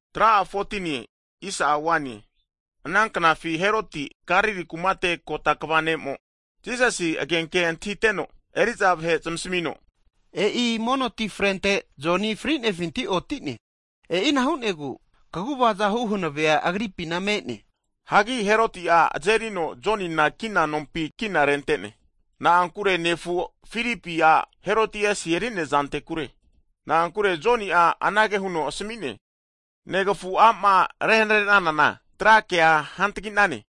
Hagi ana knafina Heroti'a Galili kumate ugota kva ne'mo, Jisasi agenke antahiteno, eri'za vahe'a zamasmino, E'i mono ti frente Joni fri'nefinti otine, e'ina hu'negu kagu'vaza hu hanavea agripina me'ne. Hagi Heroti'a Jonina azerino kina nompi kina rente'ne. Na'ankure nefu Filipi a' Herodiasi eri'nea zanktekure. Na'ankure Joni'a anage huno asmi'ne, negafu a'ma rehanre'nanana tra kea hantaginane.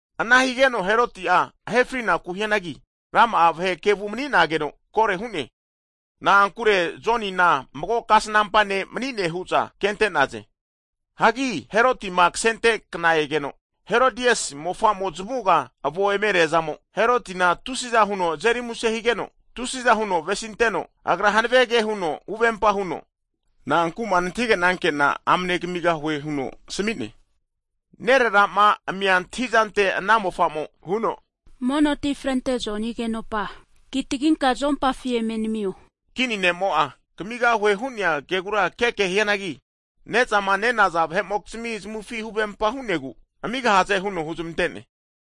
Ana higeno Heroti'a ahe frinaku hianagi, rama'a vahe kevu mani'nageno kore hu'ne. Na'ankure Jonina mago kasnampa ne' mani'ne hu'za vahe'mo'za ke'za antahi'za hu'naze. Hianagi Herotima kasente kna egeno, Herodiasi mofa'mo zamavuga avo eme reazamo, Herotina tusiza huno azeri muse higeno, tusi'za huno avesinteno, agra hanave ke huno huvempa huno, Na'anku'ma nantahigenanke'na amne kamigahue huno asmi'ne. Nerera'ma amia antahizante ana mofa'mo'a huno, Mono ti frente Joni agenopa kitaginka zuompafi eme namio. Kini ne'mo'a kamigahue hu'nea kegura keke hianagi, ne'zama nenaza vahe'mokizmi zamavufi huvempa hu'negu, amigahaze huno huzmante'ne.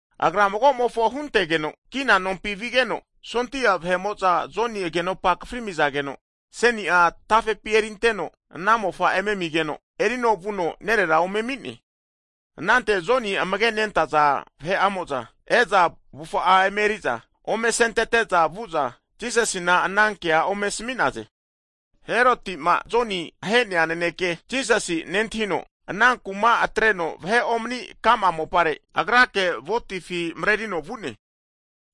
Agra mago'mofo huntegeno kina nompi vigeno, sondia vahe'mo'za Joni agenopa akafri amizageno, aseni'a tafepi erinteno, ana mofa'mofo eme amigeno, erino vuno nerera ome ami'ne. Anante Joni amage nentaza disaipol vahe'amo'za e'za avufa'a emeri'za, ome asentete'za vu'za Jisasina ana kea ome asami'naze. Heroti'ma Jonima ahe fri'nea naneke Jisasi'a nentahino, ana kuma atreno vahe omani'nea ka'ma mopare agrake votifi marerino vu'ne.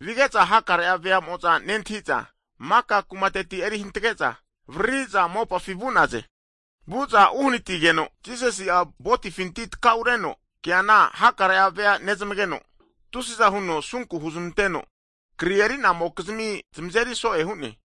Vige'za hakare veamo'za nentahi'za maka kumateti eri hantge'za avariri'za mopafi vu'naze. Vu'za uhanatizageno, Jisasi'a ventefinti takaunereno keana hakare vea nezmageno tusi'za huno asunku hunezmanteno kri eri'namokizmi zamazeri so'e hu'ne.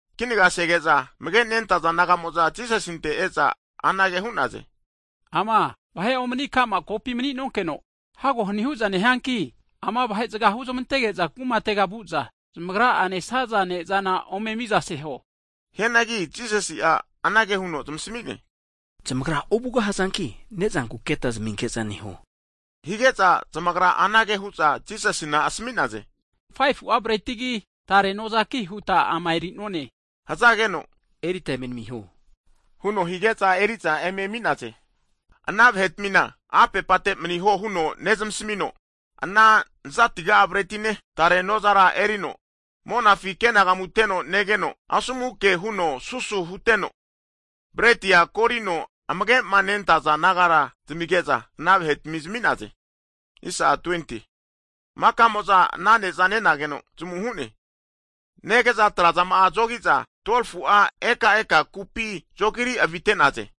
Kinaga sege'za, amage nentaza disaipol naga'mo'za Jisasinte e'za anage hu'naze, ama vahe omani ka'ma kopi mani'nonkeno, hago hani hu'za nehianki, ama vahe'zaga huzmantege'za kumatega vu'za, zamagra'a nesaza ne'zana ome miza seho. Hianagi Jisasi'a anage huno zamasmi'ne, Zamagra ovugahazanki ne'zanku keta zaminke'za neho! Hige'za, zamagra anage hu'za Jisasina asmi'naze, 5fu'a bretigi, tare nozaki huta ama eri'none hazageno, Erita eme namiho, huno hige'za eri'za eme ami'naze. Ana vahetmina apepate maniho huno nezmasmino, ana 5fu'a bretine, tare nozara erino, monafi ke'nagamuteno negeno, asomu ke huno susu huteno, bretia korino amage'ma nentaza disaipol naga zamige'za, ana vahetmina zami'ne. Makamo'za ana ne'za nageno zamu hu'ne. Nege'za atrazama'a zogi'za 12fu'a ekaeka kupi zogiri avitente'naze.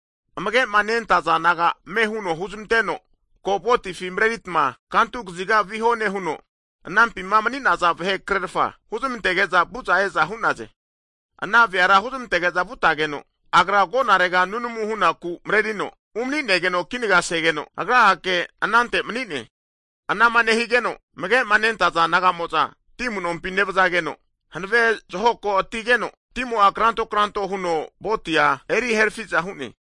Amage'ma nentaza disaipol naga ame huno huzmanteno, Ko votifi mareritma kantu kaziga viho nehuno, anampima mani'naza vahekrerfa huzmantege'za vu'za e'za hu'naze. Ana veara huzmantege'za vutageno, Agra agonarega nunamu hunaku mrerino umani'negeno, kinagasegeno Agra'ake anante mani'ne. Anama nehige'za, amage'ma nentaza disaipol naga'mo'za ti amu'nompi nevazageno, hanave zahoko atigeno timo'a kranto kranto huno votia eri rukrahe hu'za hu'ne.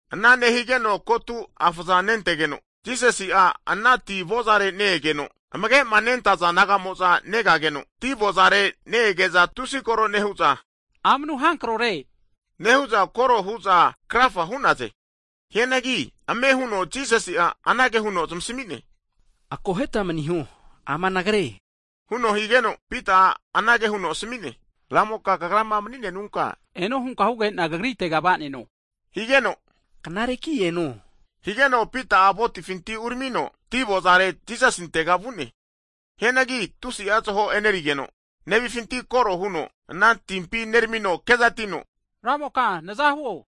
Ana nehigeno kotu afa'za nentegeno, Jisasi'a ana ti avozare ne-egeno, amage'ma nentaza disaipol naga'mo'za negageno ti avozare ne-ege'za tusi koro nehu'za, Amanu hankrore nehu'za koro hu'za krafa hu'naze. Hianagi ame huno Jisasi'a anage huno zamasmi'ne, Korora osuta akoheta maniho, ama Nagre, huno higeno, Pita'a anage huno asmi'ne, Ra'moka kagrama mani'nenunka, eno hunka huge'na kagritega va'neno. Higeno Knareki eno! higeno Pita'a votifinti uramino ti avozare Jisasintega vu'ne. Hianagi tusi'a zaho enerigeno negeno koro huno, ana timpi uneramino kezatino, Ramoka nazahuo!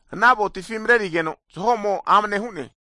ana votifi marerikeno, zaho'mo amane hu'ne.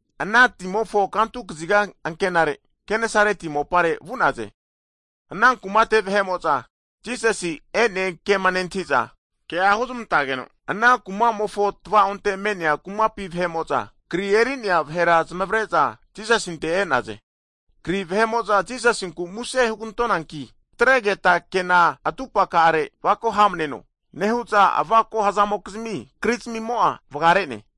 Hagi ana timofo kantu kaziga ankenare, Kenesareti mopare vu'naze. Ana kumate vahe'mo'za Jisasi'ma e'ne hazankema nentahi'za, kea huzmantageno ana kumamofo tava'onte me'nea kumapi vahe'mo'za kri eri'naza vahera zamavare'za Jisasinte e'naze. Kri vahe'mo'za Jisasinku muse hugantonanki tatregeta kena atupaka'are avako hamneno, nehu'za avako'ma hazamokizmi krizamimo'a vagare'ne.